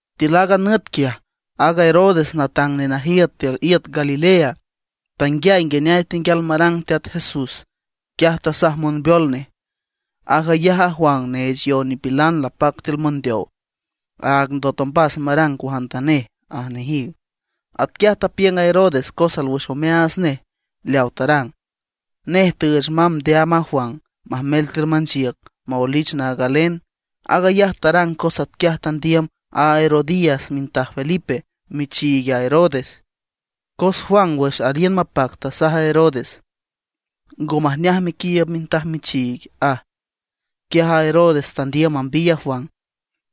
Tiül aaga nüt quiaj, aaga Herodes natang nenajiüt tiül iüt Galilea, tanguiay nguineay tenguial marang Teat Jesús. Quiaj tasaj monbeol nej: ―Aag ayaj a Juan neech yow nipilan lapac tiül mondeow. Áag ndot ombas marang cuajantanej ―aj nejiw. Atquiaj tapiüng a Herodes cos alwüx omeaats nej leaw tarang. Nej tüüch mamb ndeaam a Juan, majmel tiül manchiüc, maoelich naag galen. Aag ayaj tarang cos atquiaj tandiüm a Herodías mintaj Felipe, michiig a Herodes. Cos Juan wüx aliün mapac tasaj a Herodes: ―Ngo majneaj mequiiüb mintaj michiig ―aj. Quiaj a Herodes tandiüm mambiy a Juan,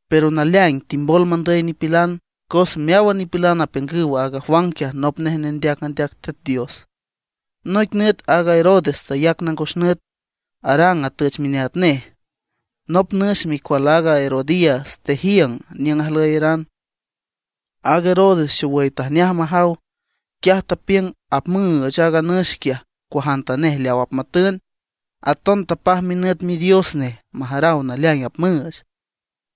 pero naleaing timbol mandüy nipilan, cos meáwan nipilan apiüngüw aaga Juan quiaj nop nej nendeac andeac Teat Dios. Noic nüt aaga Herodes tayac nangos nüt, arang atüch mineat nej. Nop nüx micual aaga Herodías tejiüng niüng ajlüyaran. Aaga Herodes xowüy tajneaj majaw. Quiaj tapiüng apmüüch aaga nüx quiaj cuajantanej leaw apmatün, aton tapaj minüt midios nej majaraw naleaing apmüüch.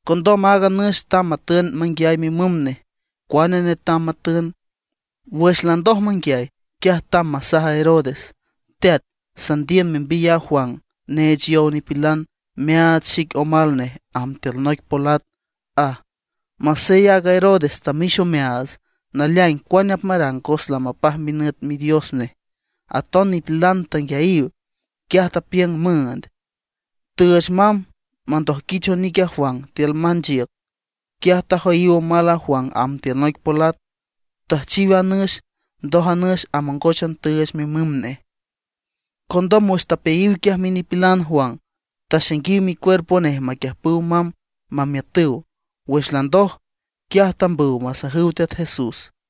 Condom aaga nüx tamb matün manguiay mimüm nej cuane netam matün. Wüx landoj manguiay, quiaj tamb masaj a Herodes: ―Teat, sandiüm membiy aaga Juan neech yow nipilan meaach xic omal nej, amb tiül noic polat ―aj. Masey aaga Herodes tamix omeaats, naleaing cuane apmarang cos lamapaj minüt midios nej, aton nipilan tanguiayiw. Quiaj tapiüng müünd. Tüüch mamb mandojquich onic a Juan tiül manchiüc. Quiaj tajoyiw omal a Juan amb tiül noic polat, tüjchiw a nüx, ndoj a nüx amongóchan tüüch mimüm nej. Condom wüx tapeayiw quiaj minipilan Juan, taxainguiw micuerpo nej maquiüjpüw mamb mamiütüw. Wüx landoj, quiaj tambüw masajüw Teat Jesús.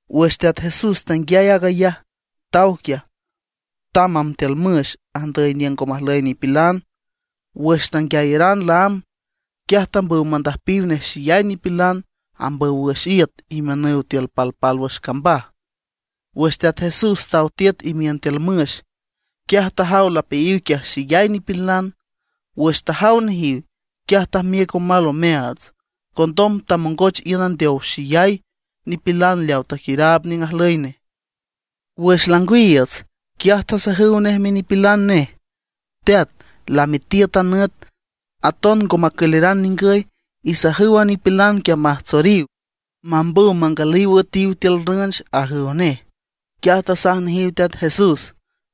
Wüx Teat Jesús tanguiay aag ayaj, taw quiaj, tamb amb tiül müx andüy niüng ngo majlüy nipilan. Wüx tanguiayaran laámb, quiaj tambüw mandüjpiw nej xeyay nipilan ambüw wüx iüt imiünüw tiül palpálwüx cambaj. Wüx Teat Jesús taw tiüt imiün tiül müx, quiaj tajaw lapeayiw quiaj xeyay nipilan. Wüx tajaw nejiw, quiaj tajmiüc omal omeaats, condom tamongoch iün andeow xeyay nipilan leaw taquiüraab niüng ajlüy nej. Wüx langwiiüts, quiaj tasajüw nej minipilan nej: ―Teat, lamitiüt a nüt, aton ngo macüleran ningüy. Isajüw a nipilan quiaj majtsoriw, mambüw mangalüw üetiw tiül rünch ―ajüw nej. Quiaj tasaj nejiw Teat Jesús: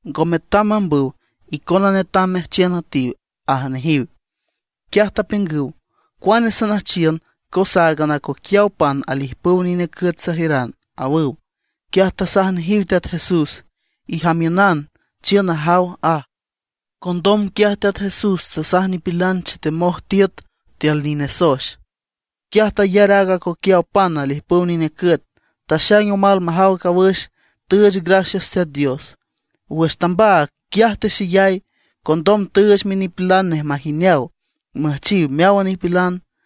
―Ngo metam mambüw, icona netam meajchiün üetiw ―aj nejiw. Quiaj tapiüngüw: ―¿Cuane sanüjchiün? Cos áagan acoquiaw pan alijpüw nine cüet sajiüran ―awüw. Quiaj tasaj nejiw Teat Jesús: ―Ijamiünan, chiün najaw ―aj. Condom quiaj Teat Jesús tasaj nipilan chetemoj tiüt tiül nine soex. Quiaj tayar aaga acoquiaw pan alijpüw nine cüet, taxaing omal majaw cawüx, tüüch gracias Teat Dios. Wüx tambaag, quiaj texeyay. Condom tüüch minipilan nej majineaw müjchiw meáwan nipilan.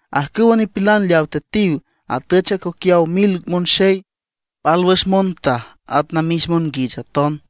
Ajcüwa nipilan leaw tetiw atüch acoquiaw mil monxey, pálwüx montaj at namix monguich aton.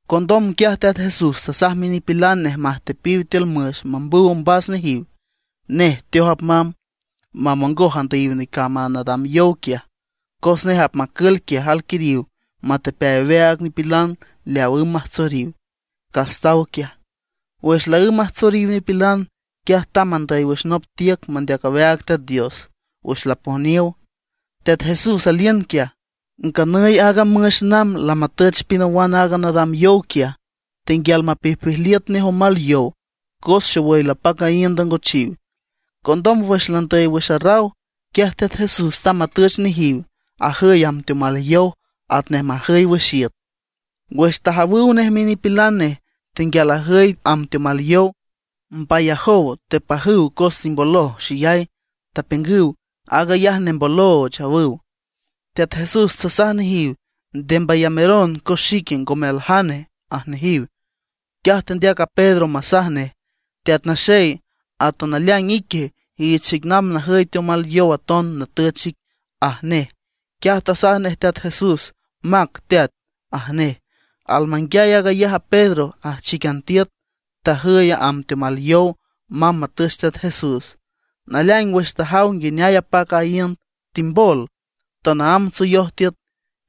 Condom quiaj Teat Jesús tasaj minipilan nej majtepiw tiül müx mambüw ombas nejiw, nej teoj apmamb, mamongoj andüyiw necamb a nadam yow quiaj. Cos nej apmacül quiaj alquiriw metepeay aweaag nipilan leaw ümb majtsoriw, cas taw quiaj. Wüx laǘmb majtsoriw nipilan, quiaj tamb andüy wüx nop tiüc mandeac aweaag Teat Dios. Wüx lapojniow, Teat Jesús aliün quiaj. Nganüy aaga müx namb lamatüch pinawan aaga nadam yow quiaj, tenguial mapijpijliüt nej omal yow, cos xowüy lapac a iünd angochiw. Condom wüx landüy wüx arraw, quiaj Teat Jesús tamb matüch nejiw, ajüy amb teomal yow atnej majüy wüx iüt. Wüx tajawüw nej minipilan nej tenguial ajüy amb teomal yow, mbayajow tepajüw cos timboloj xeyay, tapiüngüw: ―¡Aag ayaj nembolooch! ―awüw. Teat Jesús tasaj nejiw: ―¡Nde mbayameron, cos xique, ngome aljane! ―aj nejiw. Quiaj tendeac a Pedro masaj nej: ―Teat Naxey, ata naleaing ique, iich xic namb najüy teomal yow aton natüch ic ―aj nej. Quiaj tasaj nej Teat Jesús: ―Mac, teat ―aj nej. Almanguiay aag ayaj a Pedro ajchíquian tiüt, tajüy amb teomal yow mamb matüch Teat Jesús. Naleaing wüx tajaw nguineay apac a iünd, timbol, tanaámb tsoyoj tiüt.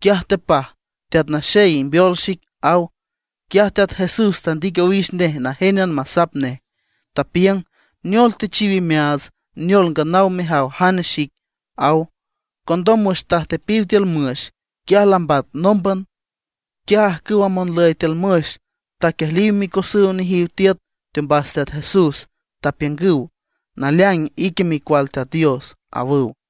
Quiaj tepaj: ―¡Teat Naxey, imbeol xic! ―aw. Quiaj Teat Jesús tandic owix nej najénan masap nej, tapiüng: ―¿Neol techiw imeaatsa; neol nganaw mejaw jane xique? ―aw. Condom wüx tajtepiw tiül müx, quiaj lambat nómban. Quiaj ajcüw monlüy tiül müx taquiejliw micosüw nejiw tiüt teombas Teat Jesús, tapiüngüw: ―¡Naleaing, ique Micual Teat Dios! ―awüw.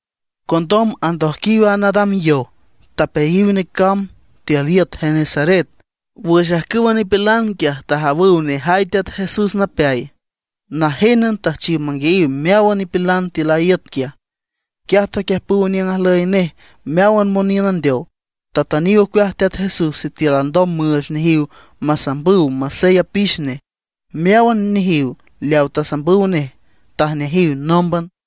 Condom andojquíwan a nadam yow, tapeayiw necamb, tiül iüt Genesaret. Wüx ajcüwa nipilan quiaj tajawüw nejay Teat Jesús napeay, najénan tüjchiw manguiayiw meáwan nipilan tiül a iüt quiaj. Quiaj taquiüjpüw niüng ajlüy nej meáwan moniün andeow. Tatüniw ocueaj Teat Jesús sitiül alndom müüch nejiw masambüw masey apix nej. Meáwan nejiw leaw tasambüw nej tajneajiw nómban.